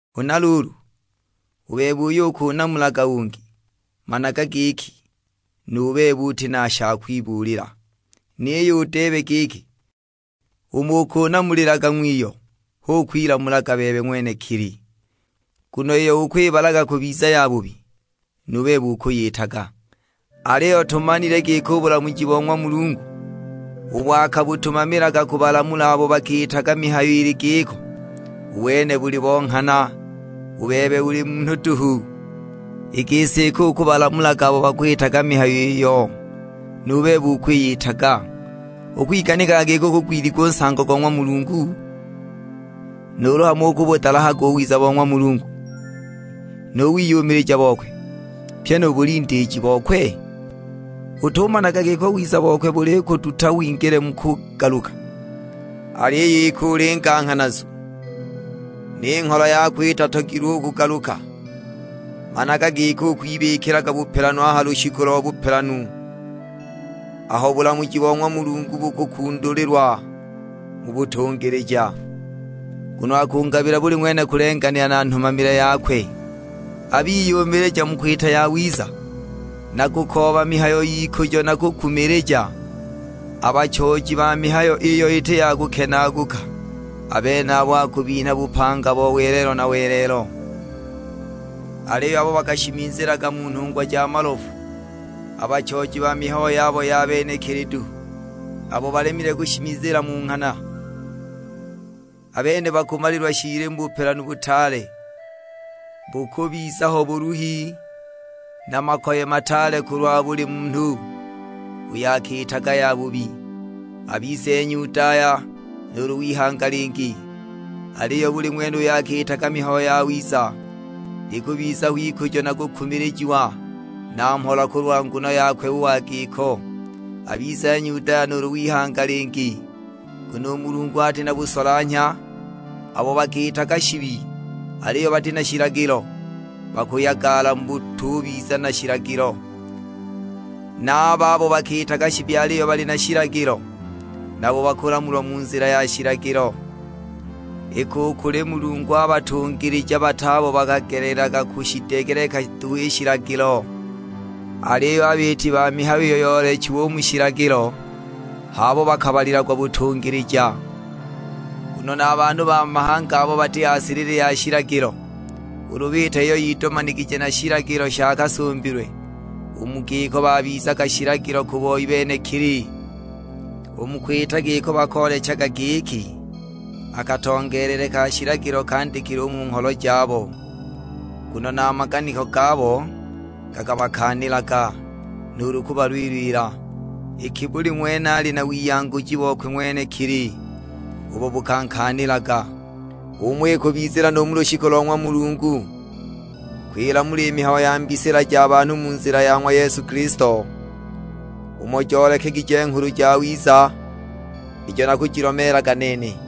Huna luulu, u bebe uyo ukunamulaga ungi, managa giki, nu bebe uti na sha kwibuulila; niyo udeebe giki, umo ukunamulilaga ng'wiyo hu ukwilamulaga bebe ng'wenekili, nguno iyo ukwibalaga kubiza yabubi, nu bebe ukuyitaga. Aliyo tumanile giki u bulamuji bo ng'wa Mulungu ubo akabutumamilaga kubalamula abo bakiitaga mihayo ili giko, u wene buli bo nghana. U bebe uli munhu duhu, i gisi iki ukubalamulaga abo bakwitaga mihayo iyo nu bebe ukwiyitaga, ukwiganikaga giki ukugwiliga u nsango go ng'wa Mulungu? Nuulu hamo ukubudalahaga u wiza bo ng'wa Mulungu, nu wiyumilija bokwe, pyi nu bulindiiji bokwe? Utumanaga giki u wiza bokwe bulikuduta wingile mu kugaluka? Aliyo iki uli nganghanazu, ni ngholo yako itatogilwe u kugaluka, managa giki ukwibikilaga bupelanu a ha lushiku lo bupelanu, aho bulamuji bo ng'wa Mulungu bukukundulilwa mu butungilija. Nguno akungabila buli ng'wene kulenganila na nhumamile yakwe. A biyumilija mu kwita yawiza, na kukooba mihayo y'ikujo na kukumilija, a bachooji ba mihayo iyo iti ya kukenaaguka, a benabo akubinha bupanga bo welelo na welelo. Aliyo abo bakashimizilaga mu nhungwa ja malofu, a bachooji ba mihayo yabo ya benekili duhu, abo balemile kushimizila mu nghana, a bene bakumalilwa shiili mu bupelanu butaale! Bukubiza ho buluhi na makoye mataale kulwa buli munhu uyo akiitaga yabubi, abize Nyudaya nuulu w'ihanga lingi. Aliyo buli ng'wene uyo akiitaga mihayo yawiza, likubiza ho ikujo na kukumilijiwa na mhola kulwa nguno yakwe u wa giko, abize Nyudaya nuulu w'ihanga lingi. Nguno u Mulungu ati na busolanhya. Abo bakiitaga shibi aliyo bati na shilagilo, bakuyagala mu butubiza na shilagilo; na a babo bakiitaga shibi aliyo bali na shilagilo, nabo bakulamulwa mu nzila ya shilagilo. Iki u kuli Mulungu a batungilija bat'abo bakagelelaga kushidegeleka duhu i shilagilo, aliyo a biiti ba mihayo iyo yoolechiwe u mu shilagilo h'abo bakabalilagwa butungilija. Nguno na a banhu ba mahanga abo bati ha silili ya shilagilo ulu biita iyo yidomanigije na shilagilo sha kasumbilwe, u mu giko babizaga shilagilo ku boi benekili. U mu kwita giko bakoolechaga giki, a katongeelele ka shilagilo kandikile u mu ngholo jabo, nguno na a maganiko gabo gakabakaanilaga, nuulu kubalwilila; iki buli ng'wene ali na wiyanguji bokwe ng'wenekili ubo bukankaanilaga. H'umo ikubizila nu mu lushiku lo ng'wa Mulungu kwilamula i mihayo ya mbisila ja banhu mu nzila ya ng'wa Yesu Kilisto, umo joolekegije Nghulu Jawiza ijo nakujilomeelaga nene.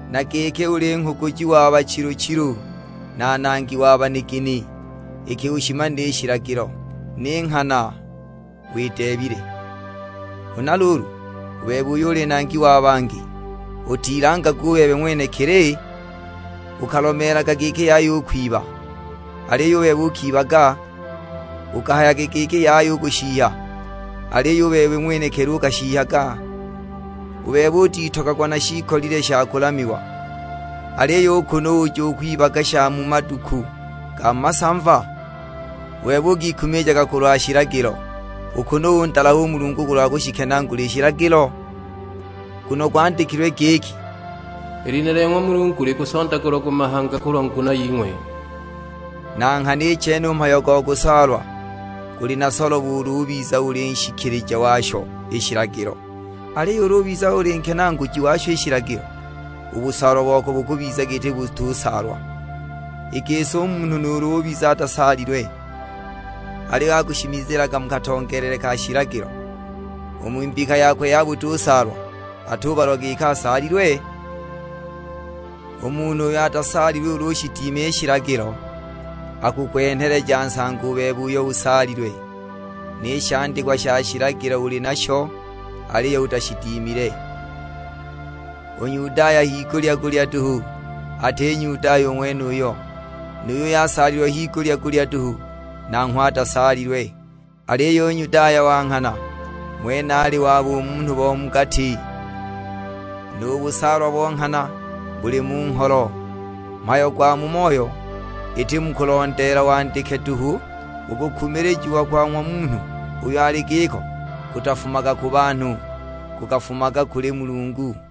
na giki uli nghuguji wa bachilu-chilu, na nangi wa banigini, iki ushimanile i shilagilo, ni nghana wideebile. Huna luulu, u bebe uyo uli nangi wa bangi, utilangaga u bebe ng'wenekili? Ukalomeelaga giki yaya u kwiba, aliyo u bebe ukibaga? Ukahayaga giki yaya u kushihya, aliyo u bebe ng'wenekili ukashihyaga? U bebe utitogagwa na shiikolile sha kulamiwa, aliyo u kunu uja ukwibaga sha mu maduku ga masamva? U bebe ukikumilijaga kulwa shilagilo, u kunu undalaha u Mulungu kulwa kushikenaagula i shilagilo? Nguno gwandikilwe giki, "I lina lya ng'wa Mulungu likusondagulagwa mu mahanga kulwa nguno ying'we!" Na nghana i chene u mhayo go kusaalwa guli na solobo ulu ubiza uli nshikilija washo i shilagilo, aliyo ulu ubiza uli nkenaaguji washo i shilagilo, u busaalwa wako bukubiza giti butusaalwa! I gisi u munhu nuulu ubiza atasaalilwe, aliyo akushimizilaga mu katongeelele ka shilagilo, u mu mbika yakwe ya butusaalwa atubalwa giki asaalilwe? U munhu uyo atasaalilwe ulu ushidima i shilagilo, akukwenheleja nsango u bebe uyo usaalilwe, ni shandikwa sha shilagilo uli nasho aliyo utashidimile. U Nyudaya higulya-gulya duhu ati Nyudaya u ng'wenuyo, nu yuyo asaalilwe higulya-gulya duhu nanghwe atasaalilwe. Aliyo u Nyudaya wa nghana, ng'wene ali wa bumunhu bo mu gati, nu busaalwa bo nghana buli mu ngholo, mhayo gwa mu moyo, iti mu kulondeela wandike duhu. U kukumilijiwa kwa ng'wa munhu uyo ali giko kutafumaga ku banhu, kukafumaga kuli Mulungu!